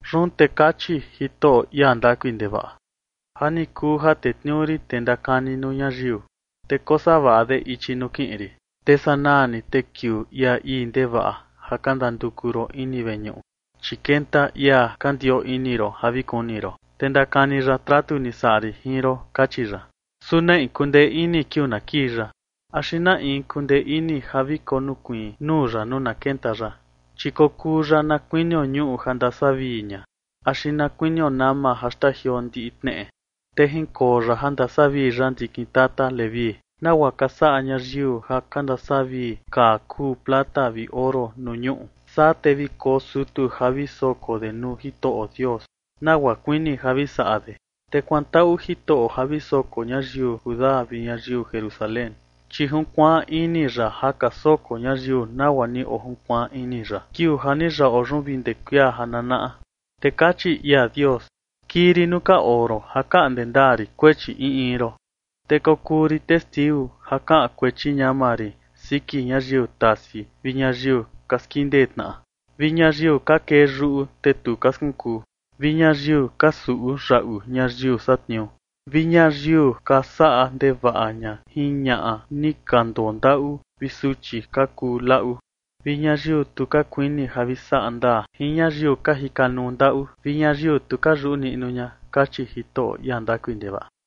Yun te kachi Jitoꞌo, ia ndakui ndevaꞌa: “Ja ni kuu ja tetniuu rin tee ndakani nuu ñayiu, te kosavaꞌa de ichi nuu kiꞌin rin, te sanaa ni te kiuu ia ii ndevaꞌa ja ka ndanduku ron ini veñuꞌu, chi kenta ia ka ndioo ini ron, ja vi kuni ron, te ndakani ya tratu ni saꞌa rin jin ron”, kachi ya. ¿Su na in kundee ini kiuu na kii ya? ¿Axi na in kundee ini ja vi konokuiin nuu ya, nuu na kenta ya? Chi kokuu ya na kuinio ñuꞌu ja ndasavii ña axi na kuinio nama ja xtajioo ndiꞌi tneꞌe. Te jinkoo ya ja ndasavii ya ndikin tata Leví, nagua ka saꞌa ñayiu ja ka ndasavii kaa kuu plata vi oro nuu ñuꞌu. Saa te vi koo sutu ja vi soko de nuu Jitoꞌo Dios, nagua kuini ja vi saꞌa de. Te kuantaꞌu Jitoꞌo ja vi soko ñayiu Judá vi ñayiu Jerusalén, chi junkuaan ini ya ja ka soko ñayiu nagua ni ojunkuaan ini ya kiuu ja ni yaꞌo yun vi ndee kuia ja nanaꞌa. Te kachi ia Dios: “Kii rin nuu ka oo ron ja kaꞌnde ndaa rin kuechi in in ron. Te kokuu rin testiu ja kaꞌan kuechi ñama rin siki ñayiu tasi vi ñayiu ka skindee tnaꞌa, vi ñayiu ka kee yuꞌu, te tu ka skunkuu, vi ñayiu ka suꞌu yaꞌu ñayiu satniuu, vi ñayiu ka saꞌa ndevaꞌa ña jin ñaꞌa ni ka ndondaꞌu vi suchi ka kuu laꞌu, vi ñayiu tu ka kuini ja vi saꞌa ndaa jin ñayiu ka jika nuu ndaꞌu, vi ñayiu tu ka yuꞌu niꞌnu ña”, kachi Jitoꞌo, ia ndakui ndevaꞌa.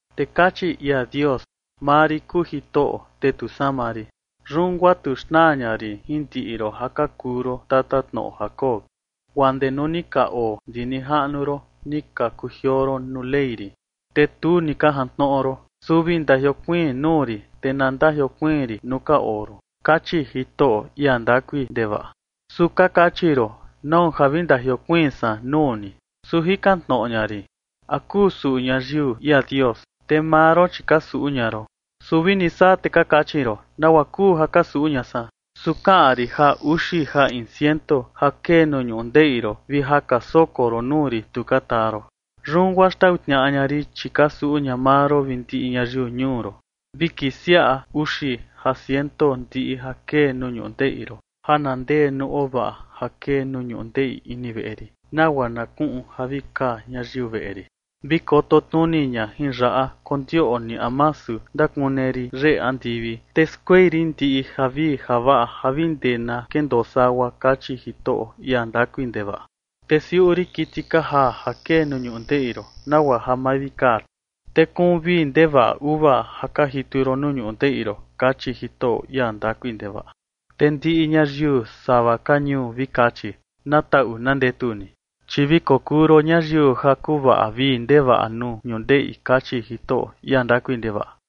Te kachi ia Dios: “Maa rin kuu Jitoꞌo, te tu sama rin. Yun guaa tu xnaa ña rin jin ndiꞌi ron ja ka kuu ron tatatnoꞌo Jacob. Guaa ndee nuu ni ka oo ndi nijaꞌnu ron ni ka kujioo ron nuu Ley rin, te tu ni ka jantnoꞌo ron. Su vi ndajiokuiin nuu rin, te na ndajiokuiin rin nuu ka oo ron”, kachi Jitoꞌo, ia ndakui ndevaꞌa. Su ka kachi ron: “¿Nau ja vi ndajiokuiin san nuu ni?” Su jikan tnoꞌo ña rin: “¿A kuu suꞌu ñayiu ia Dios?” Te maa ron, chi ka suꞌu ña ron. Su vini saa, te ka kachi ron: “¿Nagua kuu ja ka suꞌu ña san?” Su kaꞌan rin ja uxi ja in ciento ja kee nuu ñundeꞌi ron vi ja ka soko ron nuu rin tu ka taa ron. “Yun guaa xtau tniaꞌa ña rin, chi ka suꞌu ña maa ron vi ndiꞌi ñayiu ñuu ron. Vi kisiaꞌa uxi ja ciento ndiꞌi ja kee nuu ñundeꞌi ron ja na ndee nuu ovaꞌa ja kee nuu ñundeꞌi ini veꞌe rin, nagua na kuꞌun ja vi kaa ñayiu veꞌe rin. Vi koto tnuni ña jin yaꞌa, kondioꞌni a masu ndakune rin yeꞌe andivi, te skuei rin ndiꞌi javii javaꞌa ja vi ndee na kendoo sagua”, kachi Jitoꞌo, ia ndakui ndevaꞌa. “Te siuꞌu rin kiti ka jaa ja kee nuu ñundeꞌi ron, nagua ja ma vi kaa ti, te kuun vii ndevaꞌa uva ja ka jitu ron nuu ñundeꞌi ron”, kachi Jitoꞌo, ia ndakui ndevaꞌa. “Te ndiꞌi ñayiu sava ka ñuu vi kachi: Na taꞌu na ndetu ni, chi vi kokuu ron ñayiu ja kuvaꞌa vii ndevaꞌa nuu ñundeꞌi”, kachi Jitoꞌo, ia ndakui ndevaꞌa.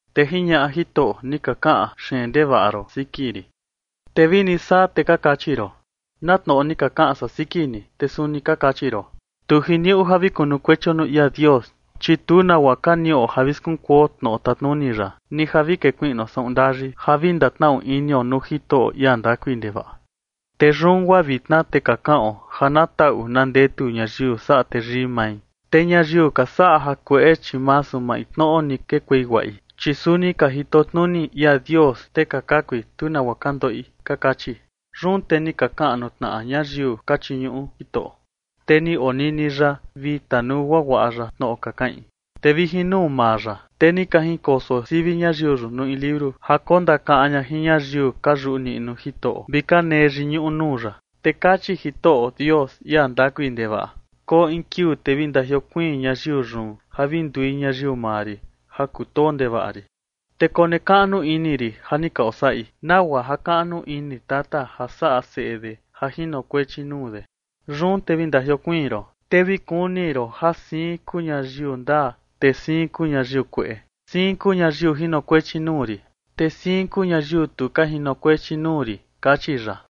Te jiñaꞌa Jitoꞌo: “Ni ka kaꞌan xeen ndevaꞌa ron siki rin, te vini saa, te ka kachi ron: ¿Na tnoꞌo ni ka kaꞌan san siki ni? Te suni ka kachi ron: Tu jiniuꞌu ja vi kunukuechio nuu ia Dios. Chi tu nagua ka niꞌo ja vi skunkuo tnoꞌo tatnuni ya, ni ja vi kekuiꞌnuo saꞌun ndayi ja vi ndatnaꞌu inio nuu Jitoꞌo, ia ndakui ndevaꞌa. Te yun guaa vitna te ka kaꞌon ja na taꞌu na ndetu ñayiu saꞌa teyii mai, te ñayiu ka saꞌa jakueꞌe, chi masu maintnoꞌo ni kekuei guaꞌi, chi suni ka jito tnuni ia Dios, te ka kakui, tu nagua ka ndoꞌi, ka kachi.” Yun te ni ka kaꞌan nuu tnaꞌa ñayiu ka chiñuꞌu Jitoꞌo, te ni onini ya vi tanuu guaguaꞌa ya tnoꞌo ka kaꞌin. Te vi jin nuu maa ya, te ni ka jinkoso sivi ñayiu yun nuu in liuru ja kondakaꞌan ña jin ñayiu ka yuꞌu niꞌnu Jitoꞌo vi ka nee yiñuꞌu nuu ya. Te kachi Jitoꞌo Dios, ia ndakui ndevaꞌa: “Koo in kiuu te vi ndajiokuiin ñayiu yun ja vi ndui ñayiu maa rin ja kutoo ndevaꞌa rin, te konekaꞌnu ini rin ja ni ka osaꞌi, nagua jakaꞌnu ini tata ja saꞌa seꞌe de ja jinokuechi nuu de. Yun te vi ndajiokuiin ron, te vi kuni ron ja siin kuu ñayiu ndaa, te siin kuu ñayiu kueꞌe. Siin kuu ñayiu jinokuechi nuu rin, te siin kuu ñayiu tu ka jinokuechi nuu rin”, kachi ya.